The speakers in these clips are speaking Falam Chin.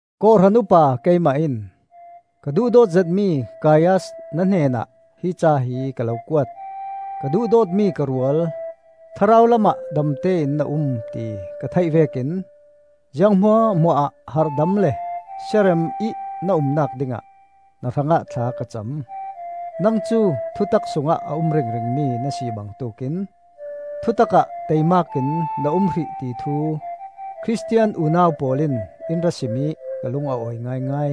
Kawhhran upa keimah in ka duhdawt zetmi Gaius na hnenah hi ca hi ka lo kuat. Ka duhdawtmi ka rual, thlarau lamah damte in na um ti ka theih vekin ziang hmuahhmuahah harhdam le siarem ih na umnak dingah na hrangah thla ka cam; Nang cu thutak sungah a um ringringmi na si bangtuk in thutak ah taimakin na um hrih ti thu Khristian unau pawl in in ra sim ih ka lung a awi ngaingai.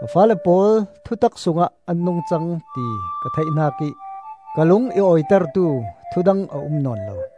Ka faale pawl thutak sungah an nungcang ti ka theih hnakih ka lung i awitertu thu dang a um nawn lo.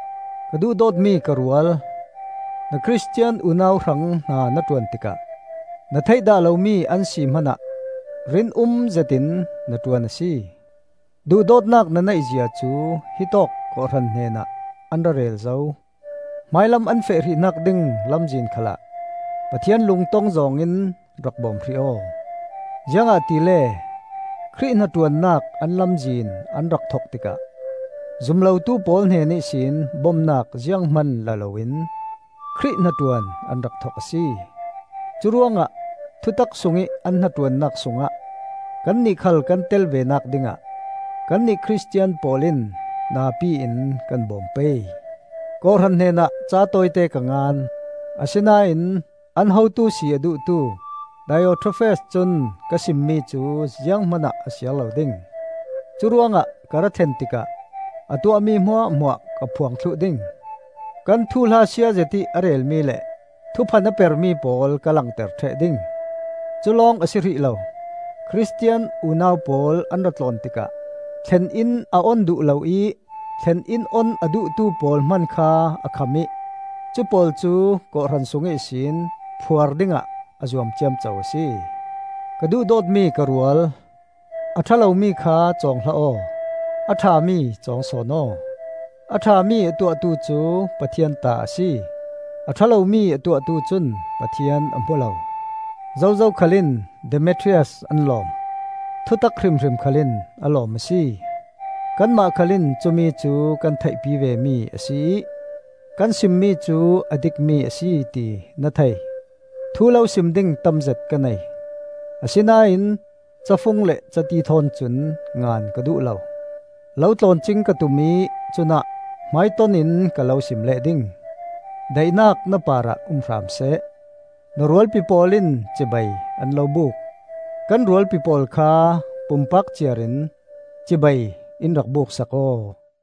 Ka duhdawtmi ka rual, na Khristian unau hrang hna na ṭuan tikah, na theih dah lomi an si hmanah rin um zetin na ṭuan a si. Duhdawtnak na neih zia cu hi tawk kawhhran hnenah an ra rel zo. Hmailam an feh hrihnak ding lamzin khalah Pathian lungtong zawng in rak bawm hrih aw. Ziangahtile Khrih hnaṭuannak an lamzin an rak thok tikah zum lotu pawl hnen ihsin bomnak ziang hman la loin Khrih hnaṭuan an rak thok a si. Curuangah thutak sungih an hnaṭuannak sungah kannih khal kan tel venak dingah kannih Khristian pawl in napi in kan bawm pei. Kawhhran hnenah ca tawite ka ngan; asinain an hotu si a duhtu Diotrefes cun ka simmi cu ziang hmanah a siar lo ding. Curuangah ka ra thlen tikah a tuahmi hmuahhmuah ka phuang thluh ding; kan thuhla siazet ih a relmi le thuphan a permi pawl ka langter ṭheh ding. Culawng a si hrih lo. Khristian unau pawl an ra tlawn tikah thlen-inn a on duh lo ih thlen-inn on a duhtu pawl hman kha a kham ih cupawl cu kawhhran sung ihsin phuar dingah a zuam ciamco a si. Ka duhdawtmi ka rual, a ṭha lomi kha cawng hlah aw; a ṭhami cawng sawn aw. A ṭhami a tuahtu cu Pathian ta a si, a ṭha lomi a tuahtu cun Pathian a hmu lo. Zozo khal in Demetrias an lawm; thutak hrimhrim khal in a lawm a si. Kanmah khal in cumi cu kan theihpi vemi a si ih kan simmi cu a dikmi a si ti na thei. Thu lo sim ding tamzet ka nei, asinain cafung le cati thawn cun ngan ka duh lo. Lo tlawn cing ka tum ih cunah hmaitonin ka lo sim leh ding. Daihnak na parah um hram seh. Na rualpi pawl in cibai an lo buk. Kan rualpi pawl kha pumpak ciar in cibai in rak buksak aw.